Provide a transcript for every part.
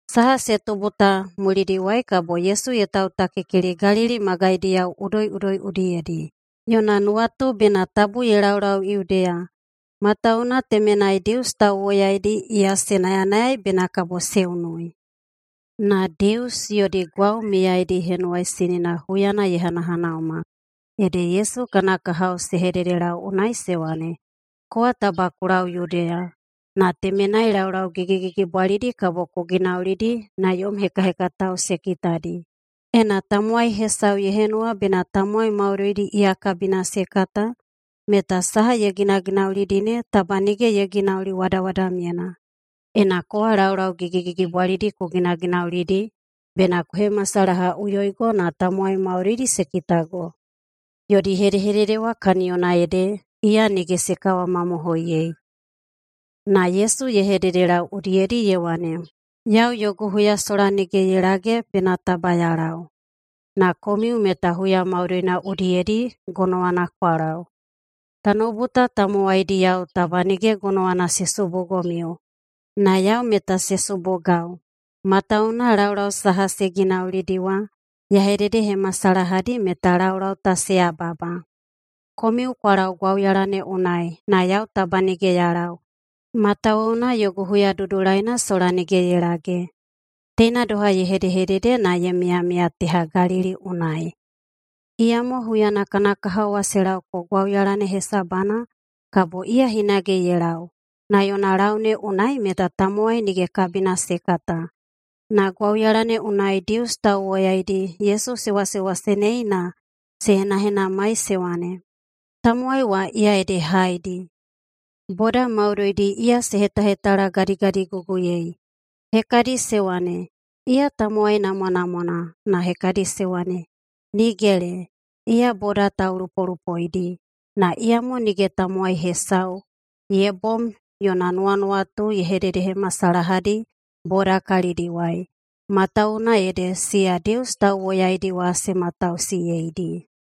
Saha se tubu ta mulidiwai kabo Yesu ye tautakikili Galili magaidiyao udoiꞌudoi udiyedi. Yona nuwatu bena tabu ye laulau Yudeya, matawuwuna temenai Dius tauwoyaidi iya se nayanayaei bena kabo se unui. Na Dius yodi Gwau Miyaidi Henuwaisinina huyana ye hanahanauma, ede Yesu kana kahao se hededelau unai se wane, “Kowa taba ku lau Yudeya, na temenai laulau gigigigibwalidi kabo ku ginaulidi na yom hekahekatao se kitadi. Ena tamowai hesau ye henuwa bena tamowai maudoidi iya kabina se kata, meta saha ye ginaginaulidi ne taba nige ye ginauli wadawadamyena. Ena kowa laulau gigigigibwalidi ku ginaginaulidi, bena ku hemasalahaꞌuyoigo na tamowai maudoidi se kitago.” Yodi hedehedede wa kaniyona ede iya nige se kawamamohoiyei. Na Yesu ye hededelau udiyedi ye wane, “Yau yogu huya sola nige ye lage bena taba ya lau. Na komiu meta huya maudoina udiyedi gonowana kwa lau. Tanoubu ta tamowaidiyao taba nige gonowana se subugomiu, na yau meta se subugau, matawuwuna laulau saha se ginaulidi wa, ya hededehemasalahadi meta laulau ta se yababa. Komiu kwa lau gwauyala ne unai, na yau taba nige ya lau, matawuwuna yogu huya dudulaina sola nige ye lage.” Teina doha ye hedehedede na ye miyamiya teha Galili unai. Iyamo huyana kana kahao wa se laoko gwauyala ne hesabana, kabo iya hinage ye lau, na yona lau ne unai meta tamowai nige kabina se kata. Na gwauyala ne unai Dius tauwoyaidi Yesu se wasewasenei na se henahenamai se wane, “Tamowai wa, iya ede haedi?” Boda maudoidi iya se hetahetalagadigadiguguyei. Hekadi se wane, “Iya tamowai namwanamwana.” Na hekadi se wane, “Nigele! Iya boda taulupolupoidi.” Na iyamo nige tamowai hesau ye bom yona nuwanuwatu ye hededehemasalahadi boda kalidiwai, matawuwuna ede siya Dius tauwoyaidi wa se matausiyeidi.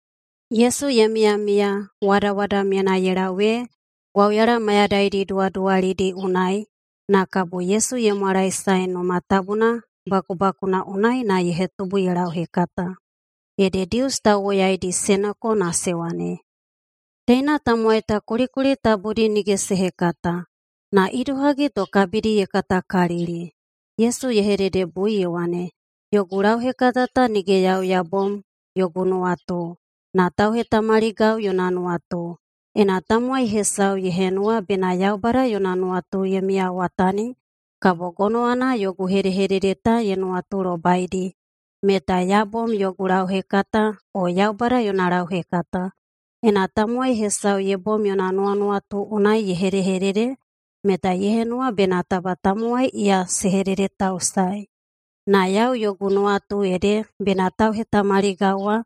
[Yesu ye miyamiya wadawadamyena ye lau ee] gwauyala mayadaidi duwaduwalidi unai, na kabo Yesu ye mwalaesae Numa Tabuna bakubakuna unai na ye hetubu ye lauhekata. Ede Dius tauwoyaidi se noko na se wane, “Teina tamowai ta kulikuli tabudi nige se hekata. Na idohagi to kabidi ye katakalili?” Yesu ye hededebui ye wane, “Yogu lauhekata ta nige yau ya bom yogu nuwatu, na tauhetamaligau yona nuwatu. Ena tamowai hesau ye henuwa bena Yaubada yona nuwatu ye miyawatani, kabo gonowana yogu hedehedede ta ye nuwatulobaidi meta ya bom yogu lauhekata o Yaubada yona lauhekata. Ena tamowai hesau ye bom yona nuwanuwatu unai ye hedehedede, meta ye henuwa bena taba tamowai iya se hededetausaei. Na yau yogu nuwatu ede bena tauhetamaligau wa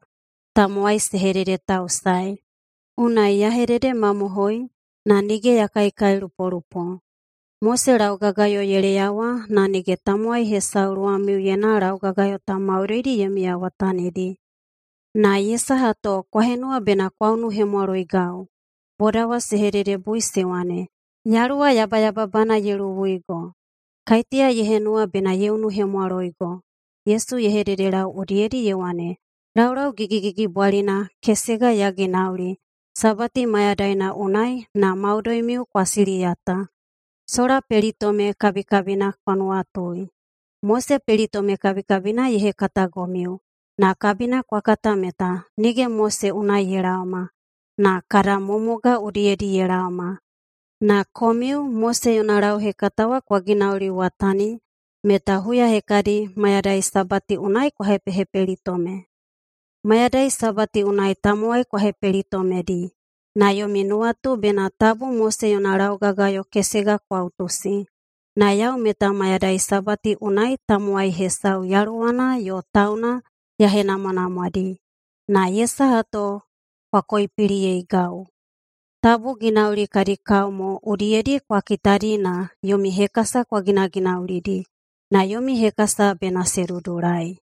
tamowai se hededetausaei. Unai ya hedehededemamohoi, na nige ya kaikailupolupo. Mose laugagayo ye leyawa, na nige tamowai hesau luwamiuyena laugagayo ta maudoidi ye miyawatanidi. Na ye saha to kwa henuwa bena kwa unuhemwaloigau?” Boda wa se hededebui se wane, “Yaluwa yabayababana ye luwuigo. Kaiteya ye henuwa bena ye unuhemwaloigo?” Yesu ye hededelau udiyedi ye wane, “Laulau gigigigibwalina kesega ya ginauli [Sabati mayadaina unai] na maudoimiu kwa siliyata. [Sola pelitome kabikabina kwa nuwatui:] Mose pelitome kabikabina ye hekatagomiu, na kabina kwa kata meta nige Mose unai ye laoma, na kada mumugao udiyedi ye laoma. Na komiu Mose yona lauhekata wa kwa ginauliwatani meta huya hekadi mayadai Sabati unai kwa hepehepelitome. Mayadai Sabati unai tamowai kwa hepelitomedi, na yomi nuwatu bena tabu Mose yona laugagayo kesega kwa utusi. Na yau meta mayadai Sabati unai tamowai hesau yaluwana yo tauna ya henamwanamwadi. Na ye saha to kwa koipiliyeigau? Tabu ginauli kadi kao mo udiyedi kwa kitadi na yomi hekasa kwa ginaginaulidi, na yomi hekasa bena se dudulai.”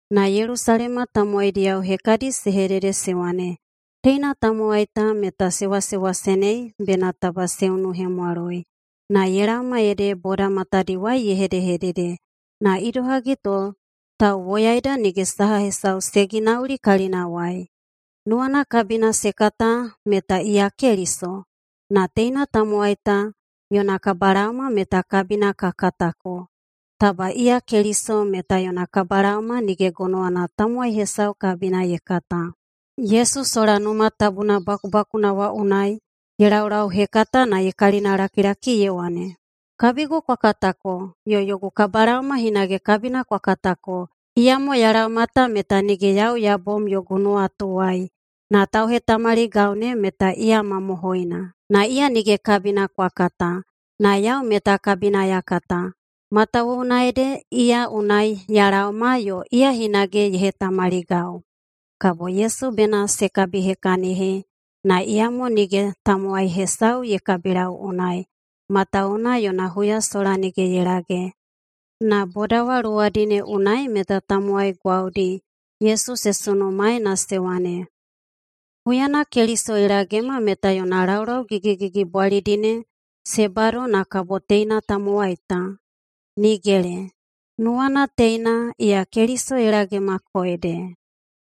Na Yelusalema tamowaidiyao hekadi se hedede se wane, “Teina tamowai ta meta se wasewasenei bena taba se unuhemwaloi. Na ye laoma ede boda matadiwai ye hedehedede, na idohagi to tauwoyaeda nige saha hesau se ginauli kalinawai? Nuwana kabina se kata meta iya Keliso? Na teina tamowai ta yona kabalaoma meta kabina ka katako. Taba iya Keliso meta yona kabalaoma nige gonowana tamowai hesau kabina ye kata.” Yesu sola Numa Tabuna bakubakuna wa unai ye laulauhekata na ye kalinalakilaki ye wane, “Kabigu kwa katako yo yogu kabalaoma hinage kabina kwa katako. Iyamo ya laoma ta meta nige yau ya bom yogu nuwatuwai, na tauhetamaligau ne meta iya mamohoina. Na iya nige kabina kwa kata, na yau meta kabina ya kata, matawuwuna ede iya unai ya laoma yo iya hinage ye hetamaligau.” Kabo Yesu bena se kabihekahini, na iyamo nige tamowai hesau ye kabilau unai, matawuwuna yona huya sola nige ye lage. Na boda wa luwadi ne unai meta tamowai gwaudi Yesu se sunumaei na se wane, “Huyana Keliso ye lagema meta yona laulau gigigigibwalidi ne se bado na kabo teina tamowai ta? Nigele! [Nuwana teina iya Keliso ye lagemako ede.]”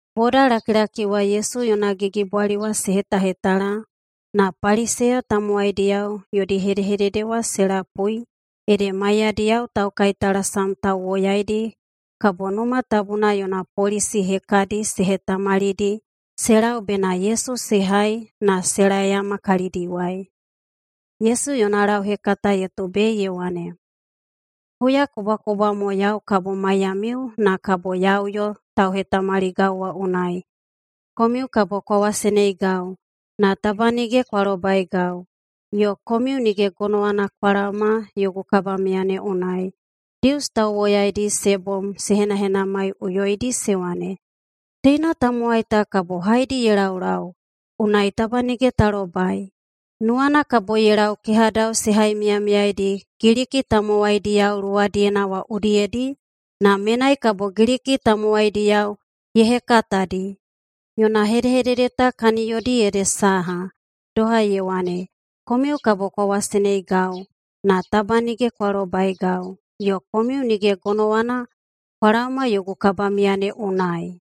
Bodalakilaki wa Yesu yona gigibwali wa se hetahetala, na Paliseya tamowaidiyao yodi hedehedede wa se lapui ede maiyadiyao taukaitalasam tauwoyaidi kabo Numa Tabuna yona polisi hekadi se hetamalidi se lau bena Yesu se hai na se laeyama kalidiwai. Yesu yona lauhekata ye tubei ye wane, “Huyakubwakubwa mo yau kabo maiyamiu na kabo ya uyo tauhetamaligau wa unai. Komiu kabo kwa waseneigau, na taba nige kwa lobaigau, yo komiu nige gonowana kwa laoma yogu kabamiya ne unai.” Dius tauwoyaidi se bom se henahenamaiꞌuyoidi se wane, “Teina tamowai ta kabo haedi ye laulau, unai taba nige ta lobai? Nuwana kabo ye lau kehadao se haimiyamiyaidi Giliki tamowaidiyao luwadiyena wa udiyedi, na menai kabo Giliki tamowaidiyao ye hekatadi? Yona hedehedede ta kaniyodi ede saha? Doha ye wane, ‘Komiu kabo kwa waseneigau, na taba nige kwa lobaigau. Yo komiu nige gonowana kwa laoma yogu kabamiya ne unai.’”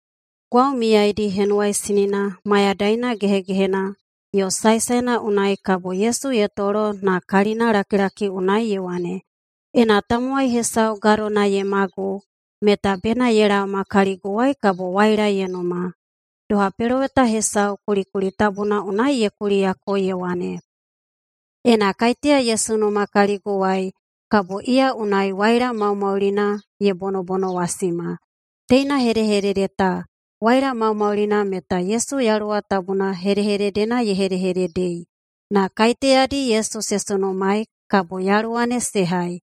Gwau Miyaidi Henuwaisinina mayadaina gehegehena yo saesaena unai kabo Yesu ye tolo na kalinana lakilakina unai ye wane, “Ena tamowai hesau gadona ye magu, meta bena ye laoma kaliguwai kabo waila ye numa. Doha peloweta hesau kulikuli tabuna unai ye kuliyako ye wane, ‘[Ena kaiteya ye sunuma kaliguwai,] kabo iya unai waila maumaulina ye bonobonowasima.’” Teina hedehedede ta, “waila maumaulina”, meta Yesu Yaluwa Tabuna hedehededena ye hedehededei. Na kaiteyadi Yesu se sunumaei kabo Yaluwa ne se hai.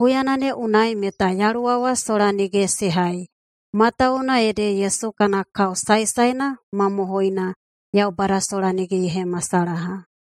Huyana ne unai meta Yaluwa wa sola nige se hai, matawuwuna ede Yesu kana kao saesaena mamohoina Yaubada sola nige ye hemasalaha.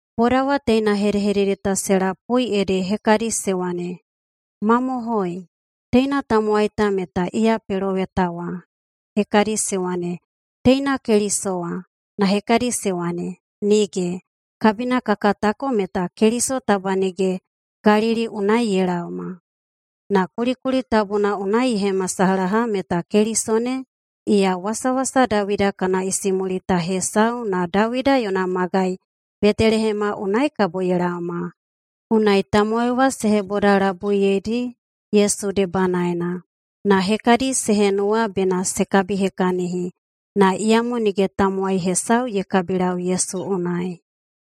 Boda wa teina hedehedede ta se lapui, ede hekadi se wane, “Mamohoi, teina tamowai ta meta iya Peloweta wa.” Hekadi se wane, “Teina Keliso wa”, na hekadi se wane, “Nige! Kabina ka katako meta Keliso taba nige Galili unai ye laoma. Na kulikuli tabuna unai ye hemasalaha meta Keliso ne, iya wasawasa Dawida kana isimulita hesau na Dawida yona magai Betelehema unai kabo ye laoma.” Unai tamowai wa se hebodalabuiyedi Yesu debanaena. Na hekadi se henuwa bena se kabihekahini, na iyamo nige tamowai hesau ye kabilau Yesu unai.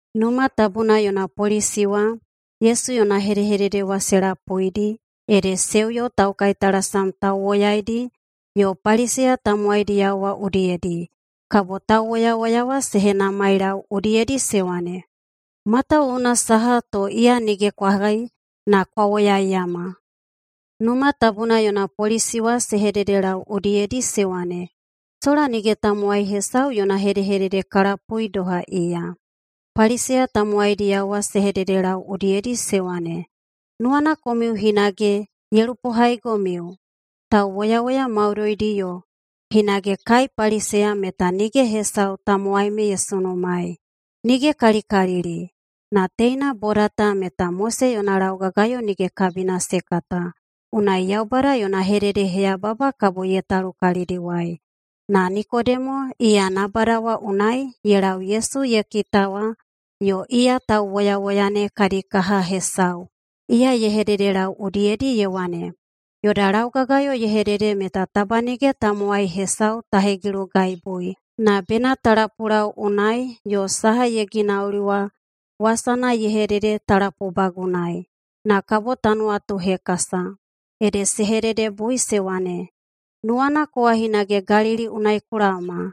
Numa Tabuna yona polisi wa [Yesu yona hedehedede wa se lapuidi] ede se uyo taukaitalasam tauwoyaidi yo Paliseya tamowaidiyao wa udiyedi. Kabo tauwoyawoya wa se henamailau udiyedi se wane, “Matawuwuna saha to iya nige kwa hai na kwa woyaiyama?” Numa Tabuna yona polisi wa se hededelau udiyedi se wane, “Sola nige tamowai hesau yona hedehedede ka lapui doha iya.” Paliseya tamowaidiyao wa se hededelau udiyedi se wane, “Nuwana komiu hinage ye lupohaigomiu? Tauwoyawoya maudoidi yo hinage kai Paliseya meta nige hesau tamowai me ye sunumaei. Nigekalikalili! Na teina boda ta meta Mose yona laugagayo nige kabina se kata, unai Yaubada yona hededeheyababa kabo ye talu kalidiwai.” Na Nikodemo, iya nabada wa unai ye lau Yesu ye kita wa yo iya tauwoyawoya ne kadi kaha hesau, iya ye hededelau udiyedi ye wane, “Yoda laugagayo ye hedede meta taba nige tamowai hesau ta hegilugaibui, na bena ta lapulau unai yo saha ye ginauli wa wasana ye hedede ta lapubagunaei, na kabo ta nuwatuhekasa.” Ede se hededebui se wane, “Nuwana kowa hinage Galili unai ku laoma?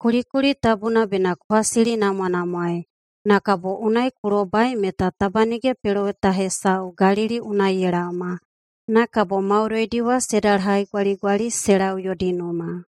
Kulikuli tabuna bena ku hasilinamwanamwaei, na kabo unai ku lobai meta taba nige peloweta hesau Galili unai ye laoma.” Na kabo maudoidi wa se dalahaigwaligwali se lau yodi numa.